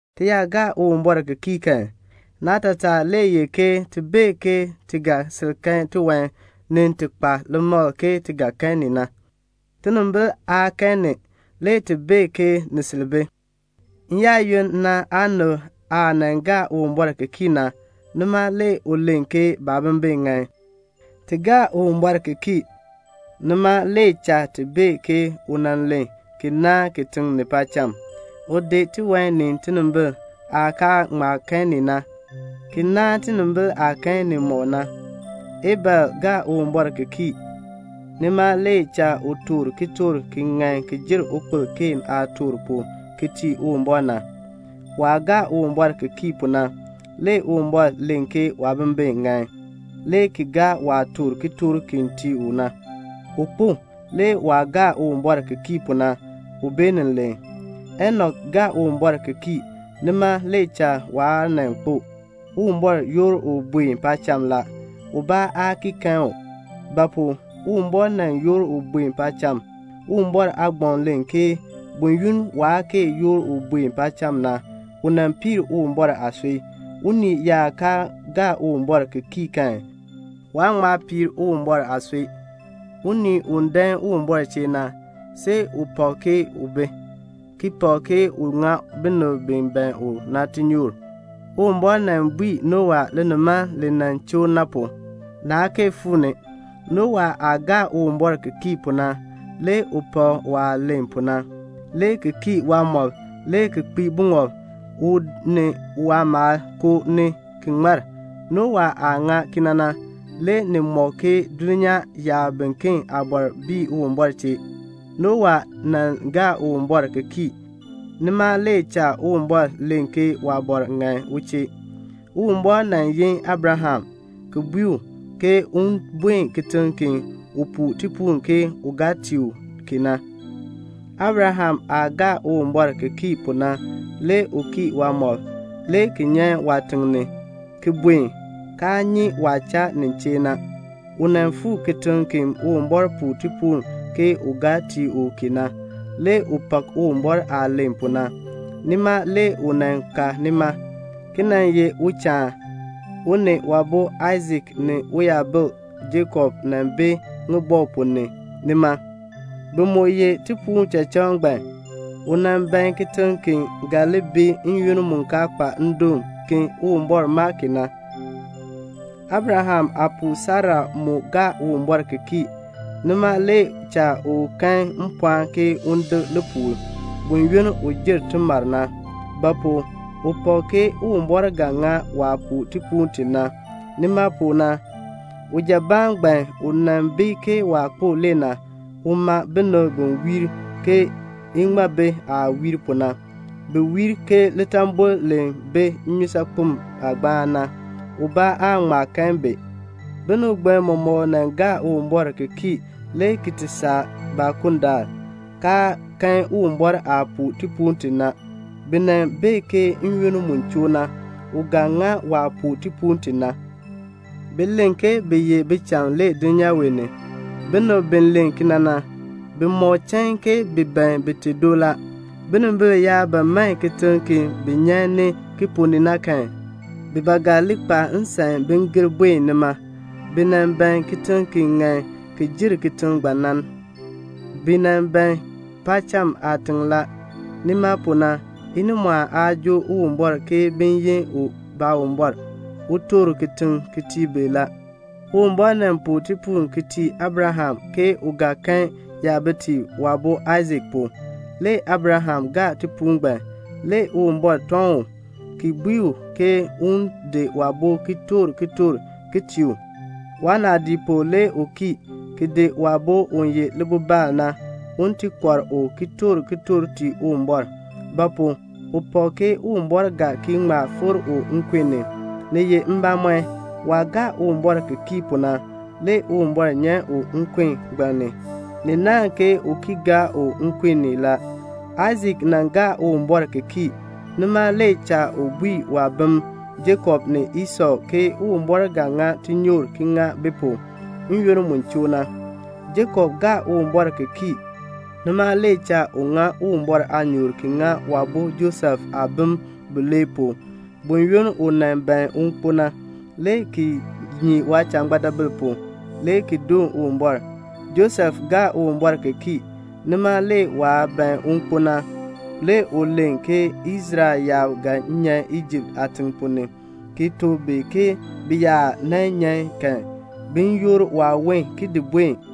Ti yaa gaa Uwumbɔr ki kii kan, naatataa le ye ke ti bee ke ti ga sil kan tiwan ni ti kpa limakl ke ti ga kan ni na. Tinimbil aa kan ni, le ti bee ke ni sil bi. N-yaayoonn na aanib aah nan gaa Uwumbɔr ki kii na, nima le u len ke baabimbin ŋan. Ti gaa Uwumbɔr ki kii, nima le cha ti bee ke u nan len ki naan kitiŋ ni paacham. U di tiwan ni tinimbil aah kaa ŋma kan ni na, ki naan tinimbil aah kan nimɔk na. Abel gaa Uwumbɔr ki kii, nima le cha u toor kitork ki ŋan ki jer ukpil Keen aah toor pu ki tii Uwumbɔr na. Waah gaa Uwumbɔr ki kii pu na, le Uwumbɔr len ke waabimbin ŋan, le ki gaa waah toor kitork ki tii u na. U kpo; le waah gaa Uwumbɔr ki kii pu na, u beenin len. Enok gaa Uwumbɔr ki kii, nima le cha waa nan kpo. Uwumbɔr yoor u buen paacham la. Ubaa aa ki kan u; ba pu? Uwumbɔr nan yoor u buen paacham. Uwumbɔr aagbaŋ len ke buyoonn waa kee yoor u buen paacham na, u nan piir Uwumbɔr aasui. Unii yaa kaa gaa Uwumbɔr ki kii kan, waan ŋma piir Uwumbɔr aasui. Unii u dan Uwumbɔr chee na, see u pak ke u bi, ki pak ke u ŋa binib bi ban u na tinyoor. Uwumbɔr nan bui Nowa linimaln li nan choo na pu, naa kee fuu ni. Nowa aah gaa Uwumbɔr ki kii pu na, le u pak waah len pu na, le ki kii waamɔb le ki kpii buŋɔb, u ni waamaal koo ni ki ŋmar. Nowa aah ŋa kena na, le ni mɔk ke dulnyaa yaab biken aabɔr bii Uwumbɔr chee. Nowa nan gaa Uwumbɔr ki kii, nima le cha Uwumbɔr len ke waabɔr ŋan u chee. Uwumbɔr nan yin Abraham, ki bui u ke un buen kitiŋ ki u puu tipuul ke u ga tii u ki na. Abraham aah gaa Uwumbɔr ki kii pu na le u kii waamɔb, le ki nyan waatiŋ ni, ki buen, kaa nyi waah cha nin chee na. U nan fuu kitiŋ ki Uwumbɔr puu tipuul ke u ga tii u ki na. Le u pak Uwumbɔr aah len pu na, nima le u nan ka nima, ki nan ye uchaan. U ni waabo Aisak ni uyabil Jakob nan bi ŋibɔk ponn ni nima. Bi mu yeh tipuul tichachaan ngbaan. U nan ban kitiŋ ki ga li bi n-yoonn mu kaa kpa ndoon, ki Uwumbɔr maa ki na. Abraham aapuu Sara mu gaa Uwumbɔr ki kii, nima le cha u kan mpɔɔn ke un dek lipuul, buyoonn u jer timar na. Ba pu? u pak ke Uwumbɔr ga ŋa waah puu tipuul ti na. Nima pu na, ujabaan ngbaan u nan bi ke waah kpo le na, u ma binib bi wiir ke iŋmabi aah wiir pu na. Bi wiir ke litambol li bi nnyusaakpem aagbaan na. Ubaa aa ŋma kahn bi. Binib ngbaan mɔmɔk nan gaa Uwumbɔr ki kii le ki ti saa baakundaal, kaa kan Uwumbɔr aah puu tipuul ti na. Bi nan bee ke n-yoonn mu choo na, u ga ŋa waah puu tipuul ti na. Bi len ke bi ye bicham le dulnyaa wee ni. Binib bi len kena na, bi mɔk chain ke bi ban bite do la. Binimbil yaa ba man kitiŋ ki bi nyan ni ki ponn ni na kan, bi ba ga li kpa nsan bin gir buen nima. Bi nan ban kitiŋ ki ŋan ki jer kitiŋ ngbaan na. Bi nan ban paacham aatiŋ la. Nima pu na inimɔɔn aa joo Uwumbɔr ke bin yi u Baawumbɔr. U toor kitiŋ ki tii bi la. Uwumbɔr nan puu tipuul ki tii Abraham ke u ga kan yabitiib waabo Aisak pu. Le Abraham gaa tipuul ngbaan. Le Uwumbɔr tɔŋ u, ki bui u ke un di waabo ki toor kitork ki tii u. Waanaadii pu le u kii, ki di waabo u ye libibaal na, un ti kɔr u ki toor kitork tii Uwumbɔr. Ba pu? u pak ke Uwumbɔr ga ki ŋma fikr u nkun ni. Ni ye mbamɔn, waah gaa Uwumbɔr ki kii pu na, le Uwumbɔr nyan u nkun ngbaan ni. Ni naan ke u ki gaa u nkun ni la. Aisak nan gaa Uwumbɔr ki kii, nima le cha u bui waabim Jakob ni Esɔ ke Uwumbɔr ga ŋa tinyoor ki ŋa bi pu n-yoonn mu choo na. Jakob gaa Uwumbɔr ki kii, nima le cha u ŋa Uwumbɔr aanyoor ki ŋa waabo Josef aabim bilee pu buyoonn u nan ban un kpo na, le ki nyii waajangbeedabil pu, le ki doon Uwumbɔr. Josef gaa Uwumbɔr ki kii, nima le waah ban un kpo na, le u len ke Israel yaab ga nyan Ijipt aatiŋ ponn ni, ki tuk bi ke bi yaa nan nyan kan, bin yoor waawon ki di buen.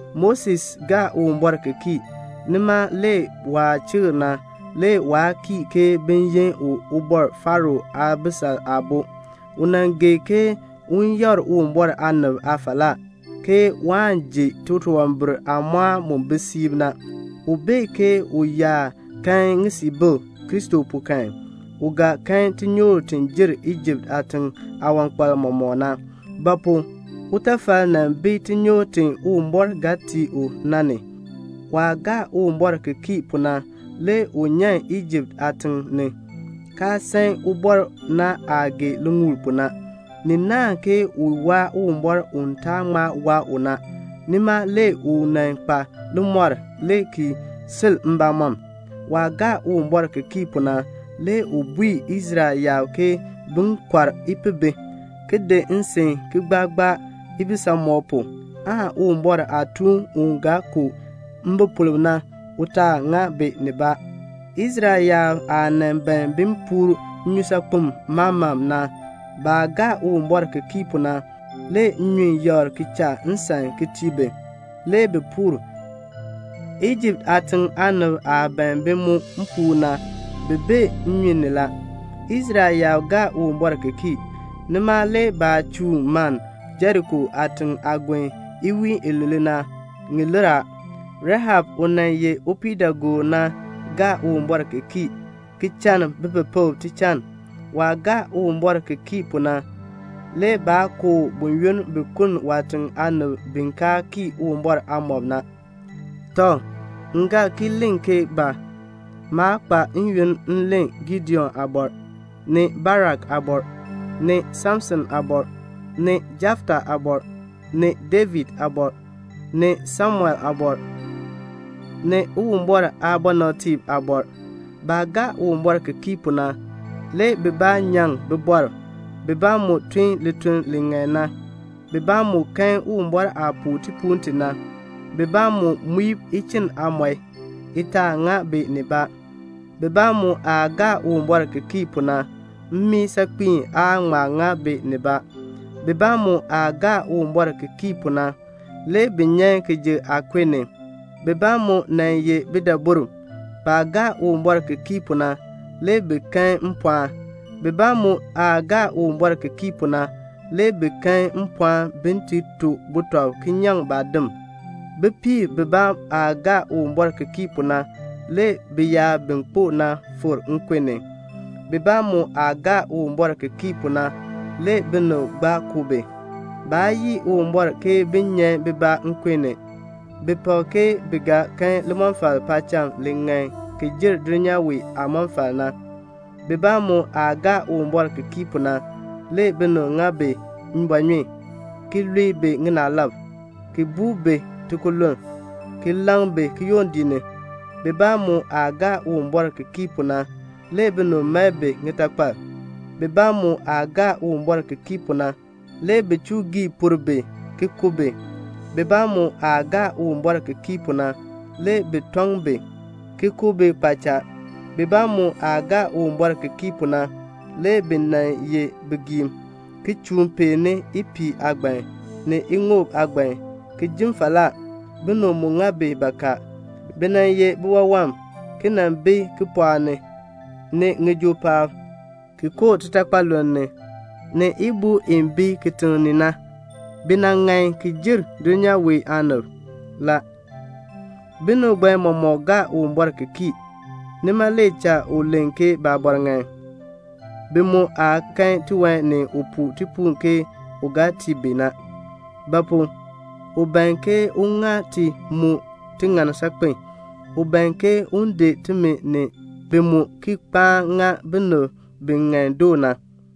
Moses gaa Uwumbɔr ki kii, nima le waah chikr na, le waa kii ke bin yi u Ubɔr Faro aabisal aabo. U nan gee ke un yakr Uwumbɔr aanib aafalaa, ke waan ji titunwambir aamɔɔn mu bi siib na. U bee ke u yaa kan ŋisiibil Kristo pu kan, u ga kan tinyoor ti jer Ijipt aatiŋ aawankpal mɔmɔk na. Ba pu? utafal nan bi tinyoor ti Uwumbɔr ga tii u na ni. Waah gaa Uwumbɔr ki kii pu na le u nyan Ijipt aatiŋ ni, kaa san ubɔr na aah gee liŋuul pu na. Ni naahn ke u waa Uwumbɔr u taan ŋma waa u na. Nima le u nan kpa limɔr le ki sil mbamɔm. Waah gaa Uwumbɔr ki kii pu na le u bui Israel yaab ke bin kɔr ipihbi, ki di nsin ki gbaa gbaa ibisamɔb pu, aan Uwumbɔr aatuun u ga ku mbipolb na, u taa ŋa bi nibaa. Israel yaab aah nan ban bin puur Nnyusaakpem Maman na, baah gaa Uwumbɔr ki kii pu na, le nnyun yakr ki cha nsan ki tii bi, le bi puur. Ijipt aatiŋ aanib aah ban bi mu puur na, bi bee nnyun ni la. Israel yaab gaa Uwumbɔr ki kii, nima le baah chuun maln Jeriko aatiŋ aagon iwiin ilule na, ŋi lir a. Rahab, u nan ye upiidaagoor na, gaa Uwumbɔr ki kii, ki chann bipepekb tichann. Waah gaa Uwumbɔr ki kii pu na, le baa ku u buyoonn bi kuln waatiŋ aanib bi kaa kii Uwumbɔr aamɔb na. Tɔ, m ga ki len ke ba? Maa kpa yoonn m len Gideon aabɔr, ni Barak aabɔr, ni Samson aabɔr, ni Jefta aabɔr, ni David aabɔr, ni Samuel aabɔr, ni Uwumbɔr aabɔnabtiib aabɔr. Baah gaa Uwumbɔr ki kii pu na, le bibaa nyaŋ bibɔrb, bibaa mu tun lituln li ŋan na, bibaa mu kan Uwumbɔr aah puu tipuul ti na, bibaa mu muib ichinn aamɔi, i taa ŋa bi nibaa. Bibaa mu aah gaa Uwumbɔr ki kii pu na, mmii saakpiin aa ŋma ŋa bi nibaa. Bibaa mu aah gaa Uwumbɔr ki kii pu na, le bi nyan kijuk aakun ni. Bibaa mu nan ye bidaburb. Baa gaa Uwumbɔr ki kii pu na, le bi kan mpɔɔn. Bibaa mu aah gaa Uwumbɔr ki kii pu na, le bi kan mpɔɔn bin ti to butɔb ki nyaŋ baadim. Bipiib bibaa aah gaa Uwumbɔr ki kii pu na, le biyaab bi kpo na fikr nkun ni. Bibaa mu aah gaa Uwumbɔr ki kii pu na, le binib gbaa ku bi. Baa yii Uwumbɔr ki bin nyan bibaa nkun ni. Bi pak ke bi ga kan limɔfal paacham li ŋan ki jer dulnyaa wee aamɔfal na. Bibaa mu aah gaa Uwumbɔr ki kii pu na, le binib ŋa bi mbɔɔnyun, ki lue bi ŋinaalab, ki buu bi tikululn, ki laŋ bi kiyondiik ni. Bibaa mu aah gaa Uwumbɔr ki kii pu na, le binib mae bi ŋitakpal. Bibaa mu aah gaa Uwumbɔr ki kii pu na, le bi chuu por bi ki ku bi. Bibaa mu aah gaa Uwumbɔr ki kii pu na, le bi [tɔŋ bi, ki] ku bi kpaacha. Bibaa mu aah gaa Uwumbɔr ki kii pu na, le bi nan ye bigiim, ki chuun peeni ipiih aagban, ni iŋoob aagban, ki jin falaa. Binib mu ŋa bi bakaa. Bi nan ye biwawam, ki nan bi kipɔɔk ni, ni ŋijoo paab, ki koo titakpaluln ni, ni ibuu i bi kitiŋ ni na. Bi nan ŋan ki jer dulnyaa wee aanib la. Binib ngbaan mɔmɔk gaa Uwumbɔr ki kii, nima le cha u len ke baabɔr ŋan. Bi mu aa kan tiwan ni u puu tipuul ke u ga tii bi na, Ba pu? u ban ke un ŋa ti mu tiŋann saakpen. U ban ke un di timi ni bi mu ki kpaan ŋa binib bi ŋan doo na.